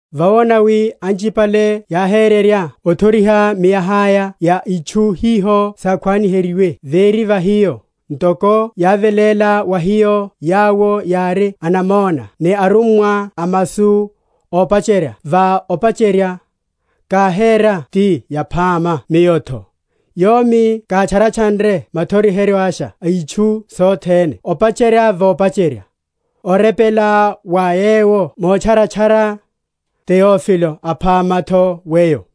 Vawona wi anchipale yáhérerya othoriha miaha’ya ya itchu hiho sákhwaniheryiwe véri va hiyo, ntoko yáveléla wa hiyo yawo yári anamona ni arummwa a masu, opacherya va opacherya, káhéra ti yaphama miyo’tho, yomi kátchanretchanre mothokororyasha itchu sothene opacherya va opacherya, orepela wa weyo motcharana‐tcharana, Teofilo aphama’tho weyo;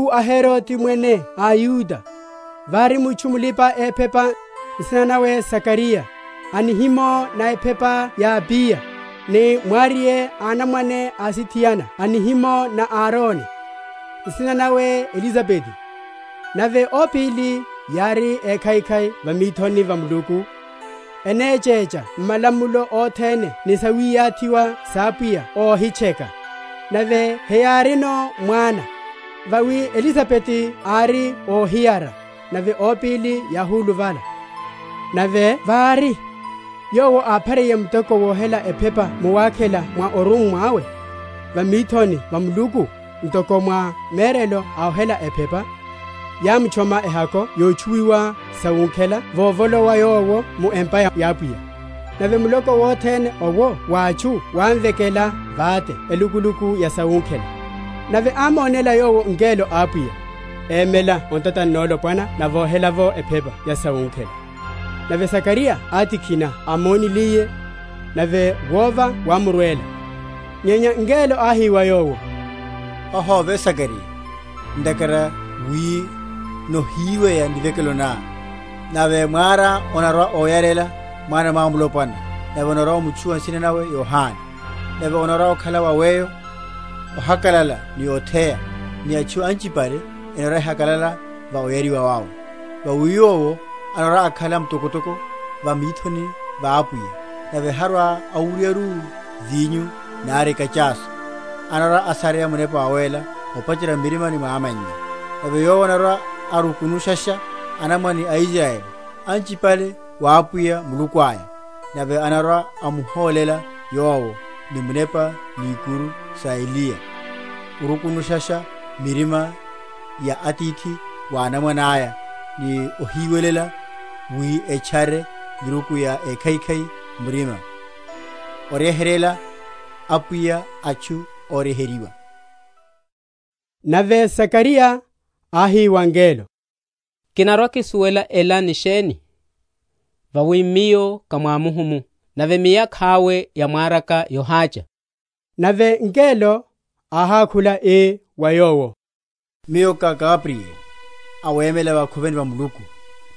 M’mahiku a Herode, mwene a Yudeya, vári mutchu mulipa‐ephepa, nsina nawe Zakariya, a nihimo na ephepa na Abiya; ni mwariye a anamwane asithiana a nihimo na Arone, nsina nawe Elisabeti. Nave ópíli yári ékhaikhai va mithoni va Muluku, enechecha m’malamulo othene ni sawiyathiwa sa Apwiya óhitcheka. Nave heyárino mwana, vawi Elisabeti ári óhiyara, nave ópíli yáhuluvala. Nave vári, yowo áphariye muteko wohela ephepa mu wakhela mwa orummwa awe, va mithoni va Muluku, ntoko mwa merelo a ohela ephepa, yámutchoma ehako yotchuwiha sawunkhela vovolowa yowo mu empa ya Apwiya. Nave muloko wothene owo wa atchu wámvekela vate elukuluku ya sawunkhela. Nave ámonéla yowo ngelo a Apwiya, emela o ntatani nolopwana na vohela’vo ephepa ya sawunkhela. Nave Zakariya átikhina ámoniliye, nave wova wámurwela. Nyenya ngelo áhi wa yowo, Ohove Zakariya, ntakhara wi nohiweya nivekelo ná, nave mwará anarwa‐oyarela mwana mwamulopwana, nave onarwa‐omutchuwa nsina nawe Yohane. Nave onarwa‐okhala wa weyo ohakalala ni otheya; nave atchu anchipale enarwa‐ehakalala va oyariwa wawe. Vawi yowo anarwa‐akhala mtokotoko va mithoni va Apwiya, nave harwa‐awuryaru vinyo nari ekachasu; anarwa‐asareya Munepa Wawéla, opacherya m’mirimani mwa amannya. Nave yowo anarwa‐arukunushasha anamwane a Israyeli anchipale wa Apwiya Muluku aya. Nave anarwa‐amuhólela Yowo, ni munepa ni ikuru sa Eliya, orukunushasha mirima ya atithi wa anamwane aya, ni óhiwelela wi etchare miruku ya ékhaikhai m’murima; oryeheryela Apwiya atchu óryeheryiwa. Nave Zakariya áhi wa ngelo, Kinarwa‐kisuwelasha ela ni sheni? Vawi miyo ká mwamuhumu, nave miyakha’we ya mwaraka yohácha. Nave ngelo áhákhula, ii wa yowo, Miyo ká Gabrieli, awemela vakhoveni va Muluku;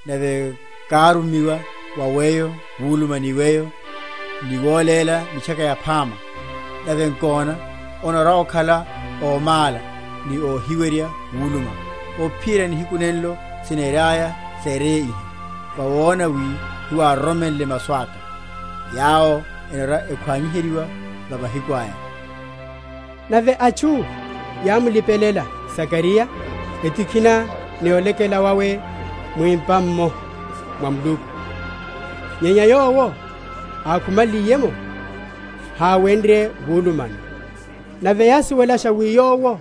nave kárumiwa wa weyo wuluma ni weyo, ni wóléla mitchaka ela yaphama. Nave nkona, onarwa‐okhala ómála ni óhiwerya wuluma, ophiyerya nihiku nenlo siniryaya sereye iha, vawona wi hewároromenle masu aka, yawo enarwa‐ekhwaniheryiwa va mahiku aya. Nave atchu yámulipelela Zakariya, etikhina ni olekela wawe mu empa’mmo mwa Muluku. Nyenya yowo ákhumaliye’mo, háwenrye wulumano: nave yásuwelasha wi yowo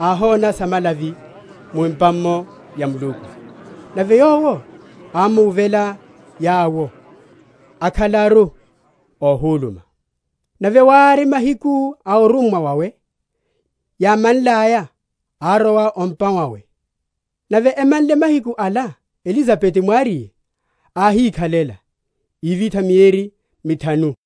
áhona samalavi mu empa’mmo ya Muluku. Nave yowo ámuwuvela yawo, akhalaru óhúluma. Nave wári, mahiku a orummwa wawe yámanlaya, árowa o’mpa wawe. Nave emanle mahiku ala, Elisabeti mwariye áhikhalela; ívitha mieri mithanu, ii,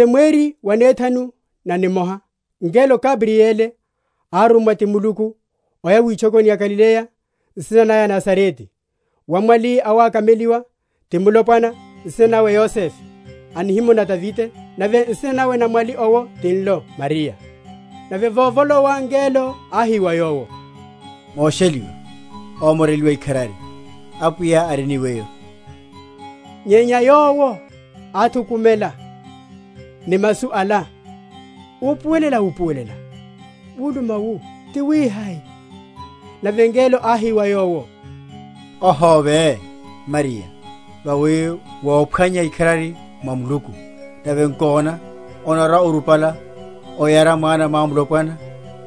Nave mweri wanethanu namoha ngelo Gabrieli árummwa ti Muluku oya witchokoni ya Galileya nsina naya Nazarete, wa mwali awakameliwa ti mulopwana, nsina nawe Yosefe, a nihimo na Davide; nave nsina nawe na mwali owo tinlo Mariya. Nave vovolowa ngelo áhi wa yowo, Mosheliwa, ómoreliwa ikharari, Apwiya ari ni weyo. Nyenya yowo áthukumela ni masu ala, upuwelela‐upuwelela wuluma wu tiwihai. Nave ngelo áhi wa yowo, Ohove, Mariya: vawi wophwanya ikharari mwa Muluku. Nave nkona, onarwa‐orupala oyara mwana mwamulopwana,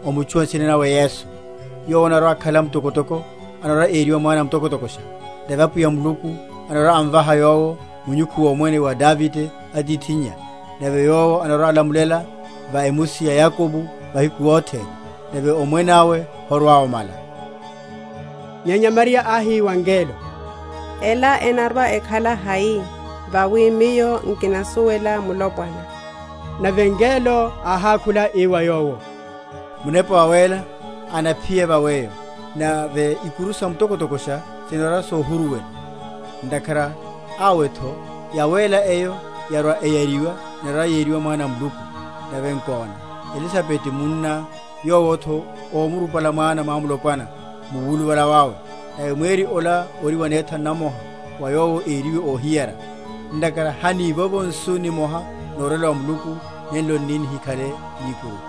omutchuwa nsina nawe Yesu. Yowo anarwa‐akhala mtokotoko, anarwa‐eriwa Mwana a Mtokotokosha: nave Apwiya Muluku anarwa‐amvaha yowo munyukhu womwene wa Davide atithinnya: nave yowo anarwa‐alamulela va emusi ya Yakobo mahiku othene; nave omwene awe horwa‐omala. Nyenya Mariya áhi wa ngelo, Ela enarwa‐ekhala hai, vawi miyo nkinasuwela mulopwana? Nave ngelo áhákhula, ii wa yowo, Munepa Wawéla anaphiya va weyo, nave ikuru sa Mtokotokosha sinarwa‐sohuruwela: ntakhara awe’tho Yawéla eyo yarwa‐eyariwa enarwa‐yeriwa Mwana a Muluku. Nave nkona, Elisabeti munná, yowo’tho omurupala mwana mwamulopwana mu wuluvala wawe; nave mweri ola ori wanethanu namoha wa yowo ériwe óhiyara. Ntakhara hanivovo nsu nimoha norwela wa Muluku nenlo n’ni nihikhale ni ikuru.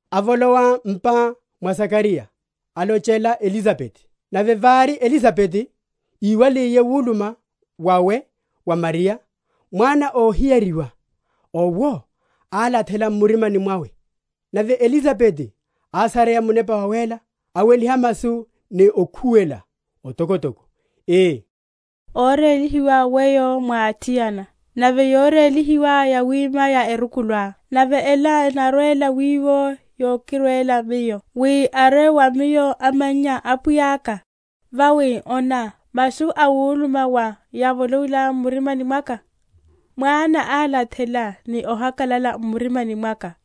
avolowa m’pa mwa Zakariya alochela Elisabeti. Nave vári Elisabeti íwaliye wuluma wawe wa Mariya, mwana óhiyariwa owo álathela m’mirimani mwawe; nave Elisabeti ásareya Munepa Wawéla; aweliha masu ni okhuwela otokotoko, ii, Órélihiwa weyo mwa athiana, nave yorélihiwa yawima ya erukuluá. Nave ela enarwela wowi yokirwela miyo, wi arwe wa miyo amannya a Apwiyaka? Vawi ona, masu awuluma wá yávolowilaya m’maruni mwaka, mwana álathela ni ohakalala m’mirimani mwaka.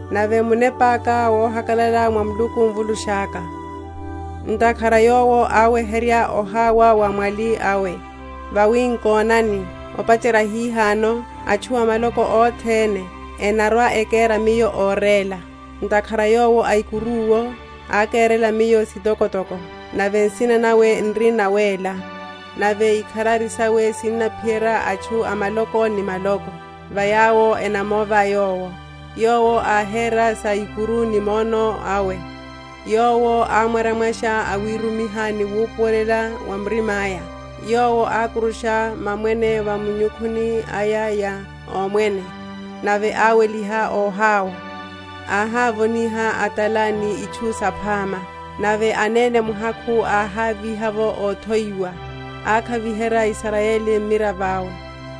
Nave munepa’ka wohakalala mwa Muluku, Mvulusha’ka. Ntakhara Yowo áweherya oháwa wa mwali awe: Vawi nkonani, opacherya hihano, atchu a maloko othene enarwa‐ekera miyo óréla. Ntakhara Yowo Aikuru’wo ákerela miyo sitokotoko; Nave nsina nawe n’ri nawéla. Nave ikharari sawe sinaphiyerya atchu a maloko ni maloko Va yawo enamova Yowo. Yowo áhéra sa ikuru ni mwono awe; Yowo ámwaryamwarya awirumiha ni wupuwela wa murima’ya. Yowo ákurusha mamwene va minyukhuni aya ya omwene, Nave áweliha óháwa. Áhávoniha a’tala ni itchu saphama, Nave anene muhakhu áháviha’vo óthowiwa. Ákhaviherya Israyeli mmiravo awe,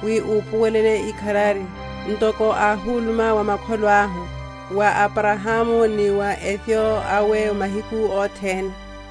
Wi upuwele ikharari, (Ntoko áhuluma wa makholo ahu) Wa Abrahamu ni wa epyo awe mahiku othene.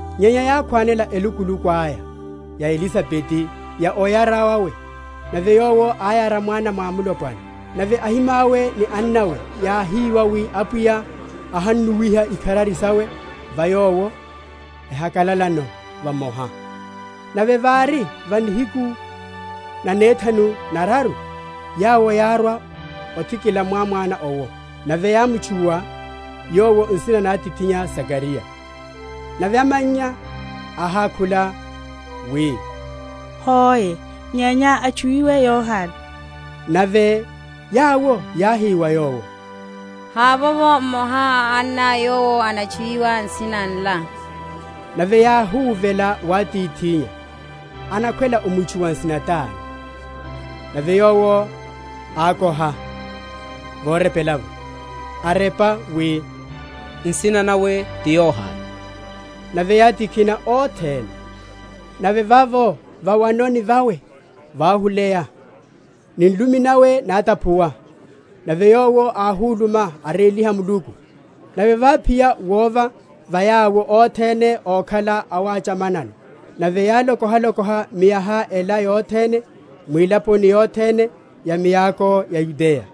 Nyenya yákhwanela elukuluku aya ya Elisabeti, ya oyara wawe, nave yowo áyara mwana mwamulopwana. Nave ahimawe ni annawe yáhiwa wi Apwiya áhannuwiha ikharari sawe va yowo; chakalalano vamoha. Nave vári va nihiku nanethanu neraru yawo yárwa othikila mwamwana owo; nave yámutchuwa yowo nsina na atithinnya Zakariya. Nave amannya áhákhula, wi, Hoe; nyenya atchuwiwe Yohane. Nave yawo yáhi wa yowo, Havovo mmoha a anná yowo anatchuwiwa nsina nla. Nave yáhuvela wa atithinnya, anakhwela amutchuwe nsina tani? Nave yowo ákoha yorepela’vo, arepa, wi, Nsina nawe ti Yohane. Nave yátikhina othene. Nave vavo va’wanoni vawe váhuleya, ni nlumi nawe nátaphuwa, nave yowo áhuluma, aréliha Muluku. Nave váphiya wova va yawo othene ókhala awachamanano; nave yáloko?-?halokoha miaha ela yothene mwilaponi yothene ya miako ya Yudeya.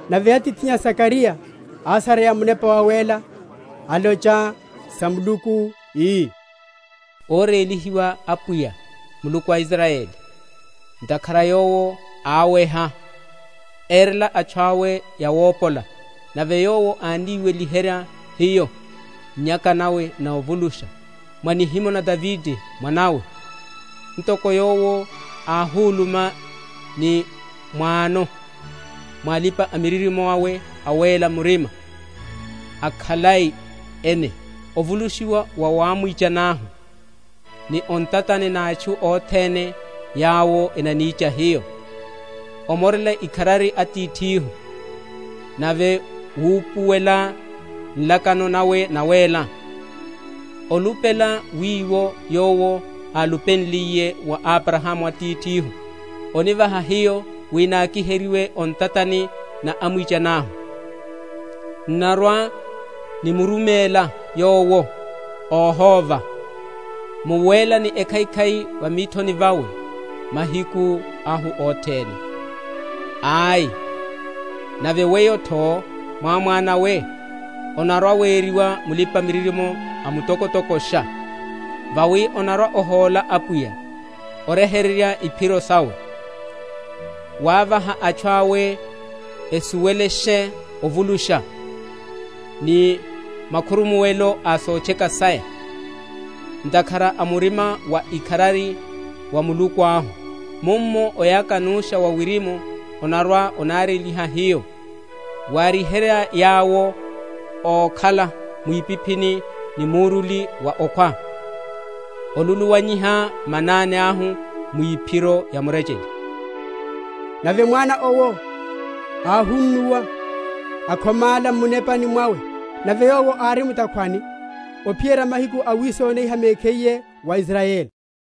Nave atithinnya Zakariya ásareya Munepa Wawéla, alocha sa Muluku, ii, Órélihiwa Apwiya, Muluku a Israyeli; Ntakhara Yowo áweha, erela atchu awe yówopola, Nave Yowo ániweliherya hiyo nnyaka na ovulusha, Mwa nihimo na Davide mwanawe. (Ntoko Yowo áhuluma ni m’wano mwa alipa‐miririmo awe awéla‐murima, akhalai ene), Ovulushiwa wa wa amwichani ahu, Ni o ntatani na atchu othene yawo enanicha hiyo; Omorela ikharari atithihu, Nave wupuwela nlakano nawe nawéla; Olupela wiwo Yowo álupenliye wa Abrahamu atithihu, Onivaha hiyo, wi nákiheryiwe o ntatani na amwichani ahu, N’narwa‐nimuruméla Yowo, óhóva, Mu wéla ni ekhaikhai va mithoni vawe, mahiku ahu othene. Ai, nave weyo’tho mwamwana we, onarwa‐weriwa mulipa‐miririmo a Mtokotokosha: Vawi onarwa‐ohóla Apwiya, oryeherya iphiro sawe; Wávaha atchu awe esuwelashe ovulusha, Ni makhurumuwelo a sotcheka saya, Ntakhara a murima wa ikharari wa Muluku ahu. Mummo oyaka nusha wa wirimu onarwa‐onareryiha hiyo; Waryiherya yawo ókhala mwipiphini ni muruli wa okhwa; Oluluwanyiha manani ahu mwiphiro ya murechele. Nave mwana owo áhunnuwa, akhomála m’munepani wawe, nave yowo ári mu’takhwani, ophiyerya mahiku awisoniha mekhiye wa Israyeli.